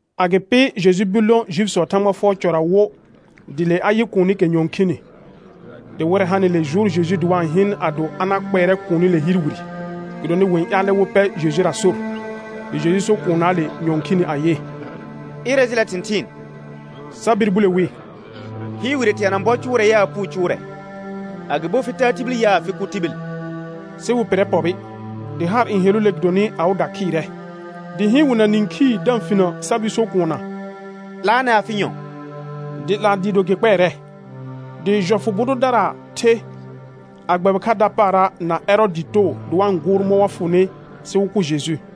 Agɩpɩ Jeju bir lõ Juifisɔɔ Thãgba fʋɔr cɔra wo; dɩ le a yɩ kuunikɛ nyɔ̃ɔ khini. Dɩ wɩrɛ hanɩle jʋʋr Jeju dɩ wa-n hɩɩn ado a na kpɛɛrɛ kuunile hɩɩr wire, gɩdonɩ wɩ-n ƴaalɛ wɩ pɛr Jejura sor. Dɩ Jeju so kuunnaale nyɔ̃ɔ khini ayɩ: Ɩrɛ jɩlɛ thɩ̃thɩɩn. Sa bir bule wi: Hɩɩr wire teana bɔ cʋʋrɛ yaa puu cʋʋrɛ, agɩbo fɩ taa tibil yaa, fɩ kʋ tibil? Sɩ wɩ pɩrrɛ pɔbɩ. Dɩ haar n heluule gɩdonɩ awɩda khɩɩrɛ, dɩ hɩɩn wɩ na nĩkhii da-n finə sa bir so kuunna: 'Laanɛ afɩ nyɔ̃; dɩ 'laa dɩɩ do gɩ kpɛɛrɛ. Dɩjɔfʋ bʋ dʋdara the, a gbɛbɩ kha dapaara na Ɛrɔɔdɩɩ too dɩ wa-n gʋʋr mɔ̃ wa fʋnɩ sɩ wɩ kʋ Jeju.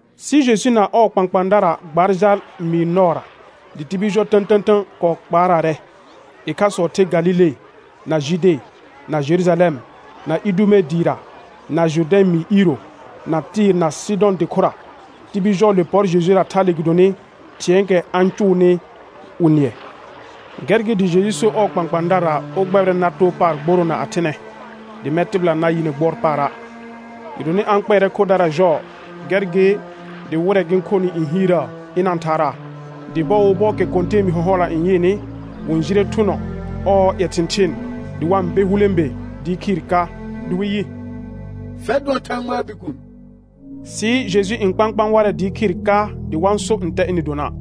Sɩ Jeju na ɔɔ kpãkpãadara gbaar jal mɩɩr nɔɔra, dɩ tibil jɔ tə̃tə̃tə̃ kɔɔ kpaaraarɛ. Ɩkhasɔ ther Galile, na Jude, na Jerujalɛm, na ldume dɩɩra, na Jʋrdɛ̃ mɩɩr iiro, na Tɩɩr na Sɩdɔ̃ dɩ khʋra. Tibil jɔɔle pɔr Jejura thale gɩdonɩ thɩ̃ɛɛkɛ a-n cʋʋnɩ wɩ nɩɛ. Gɛr gɩ dɩ Jeju so ɔɔ kpãkpãadarara wɩ gbɛbɩrɛ nar too paar gboroona a thɩnɛ, dɩ mɛ̃ tɩbɩla na yɩ nɩ gbʋɔr paara'. Gɩdonɩ a-n kpɛɛrɛ khodara jɔɔ, gɛr gɩ dɩ wɩrɛ gɩ-n khonɩ n hiirəə ɩna-n thaaraa. Dɩ bɔɔ wo bɔɔkɛ kɔ̃tɛɛbi hɔ̃hɔla n yɩɩnɩ, wɩ-n jire thʋnɔ ɔɔ ƴɛ thɩ̃thɩɩn dɩ wa-n be hulẽbe dɩɩ khɩɩr ka, dɩ wɩ yɩ: Fɛr dʋɔn Thãgbaa Bikuun. Sɩ Jeju n kpãkpãa warɛ dɩɩ khɩɩr ka dɩ wa-n so ntɛ ɩnɩ dona'.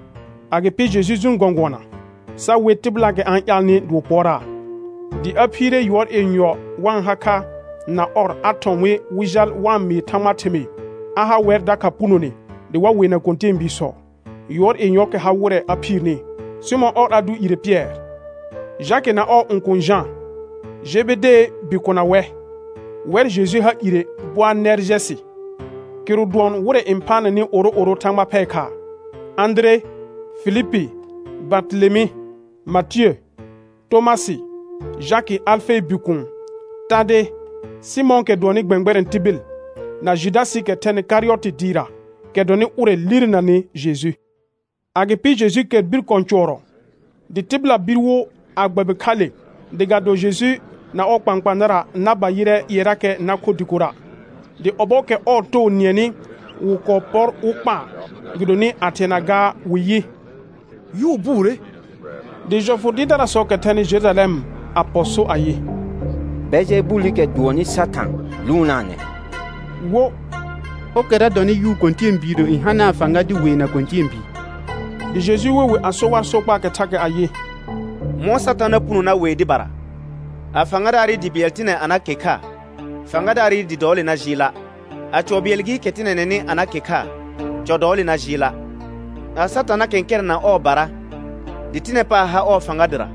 Agɩpɩ Jeju jʋʋn gɔ̃gʋɔna, sa we tɩbɩlaakɛ a-n ƴaalnɩ dɩ wɩ pʋɔraa. Dɩ a phiire yʋɔr yenyɔ wa-n ha kha na ɔr a thɔ̃ wɩ wɩ jal wa-n mɩɩ Thãgbaa thɩmɩɩ; a ha wɛr dakha punone dɩ wa weena kɔ̃tɛɛbiisɔ. Yʋɔr yenyɔɔkɛ ha wɩrɛ a phiirni: Sɩmɔ̃ ɔr a dʋ ire Pɩɛr, Jakɩ na ɔɔ õkuun Jã, Jebedee bikona wɛ; wɛr Jeju ha ire Boanɛrjɛsɩ, kɩrʋ dʋɔn wɩrɛ n phaanɛnɩ oro'oro thãgba phɛɛ khaa; Ãdire, Filipi, Bartelemɩ, Matiə, Tomasɩ, Jakɩ Alfee bikuun, Tade, Sɩmɔ̃ɔkɛ dʋɔnnɩ gbɛ̃gbɛrɛ̃ tibil, na Judasɩɩkɛ thɛnɩ Karɩyɔtɩ dɩɩra, kɛ dɔnɩ ʋrɛ lirenanɩ Jeju. Agɩpɩ Jeju kɛr bir kɔ̃ cʋɔrɔ, dɩ tɩbɩla bir wo a gbɛbɩ kha le, dɩ ga do Jeju na ɔɔ kpãkpãadara na ba yɩrɛ ƴɩɛrakɛ na kho dɩkora'. Dɩ ɔbɔɔkɛ ɔɔ too nɩɛnɩ wɩ kɔɔ pɔr wɩ kpaa, gɩdonɩ a thɩɛna gaa wɩ yɩ: Yʋʋ buure. Dɩ jɔfʋ dɩɩrdarasɔɔkɛ thɛnɩ Jerujalɛm a pɔ so ayɩ: Bɛljɛbulikɛ dʋɔnnɩ Satã lʋʋnaanɛ, wo: Ɔrkɛra dɔnɩ yʋʋ kɔ̃tɛɛbiirə n hanaa fãga dɩ weena kɔ̃tɛɛbii. Dɩ Jeju we wɩ a so war sokpaakɛ thakɛ ayɩ: Mɔ̃ Satã na puno na wee dɩbara? A fãgadaarɩ dɩ bɩɛl tɩnɛ a na ke kha, fãgadaarɩ dɩ dɔɔle na jɩɩla'. A cɔ bɩɛl gɩɩkɛ tɩnɛnɛnɩ a na ke kha, cɔ dɔɔle na jɩɩla'. A Satã na kɛ̃kɛrɛ̃ na ɔɔbara dɩ tɩnɛ paar har ɔɔ fãga dɩra,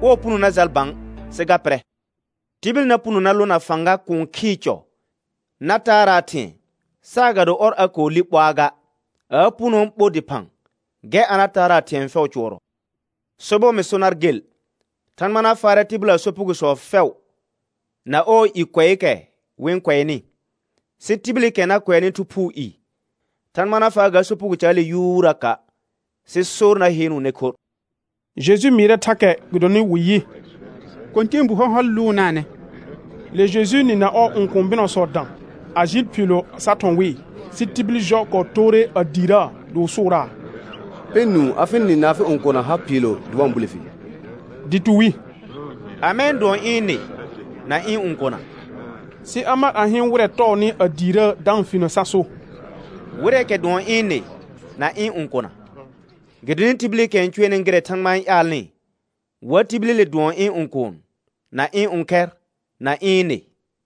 ɔɔ puno na jal bã sɩ ga pɩrɛ. Tibil na puno na lõ na fãga kũu khɩɩ cɔ na taaraa thɩ̃ɛ, saagado ɔr a kɔɔ li ɓoaa ga, a a punoo ɓo dɩphã gɛr a na taaraa thɩ̃ɛ fɛʋ cʋɔrɔ. Sobɔr mɩ so nar gel: Thãgba na faarɛ tɩbɩlaa sopugosɔ fɛʋ na ɔɔ i kʋɛɛkɛ wɩ-n kʋɛnɩ. Sɩ tibilikɛ na kʋɛanɩ Thu Phuu i, Thãgba na faa ga sopugo caale yuuraka', sɩ sor na heenuune khorr. Jeju mɩɩrɛ thakɛ gɩdonɩ wɩ yɩ: Kɔ̃tɛɛbu hɔ̃hɔl lʋʋnaanɛ. Le Jejuu nɩ na ɔɔ õkũu bɩnɔsɔ dã, a jɩɩl phiilo sa thɔ̃ wɩɩ. Sɩ tibil jɔ kɔɔ toore a diirəə dɩ wɩ sʋʋraa: Pɛ nũu, afɩ nɩ na afɩ õkona har phiilo dɩ wa-n bule fi. Dɩ tu wi: Amɛ n dʋɔn ɩ̃ nɩ, na ɩ̃ õkona? Sɩ a mar a hɩɩn wɩrɛ tɔɔnɩ a diirəə da-n finə sa so: Wɩrɛɛkɛ dʋɔn ɩ̃ nɩ na ɩ̃ õkona; gɩdonɩ ɩibilikɛ n cʋɛɩɩɩ gɩrɛ Thãgba n ƴaalnɩ, wa tibilile dʋɔn ɩ̃ õkuun, na ɩ̃ õkhɛr, na ɩ̃ nɩ.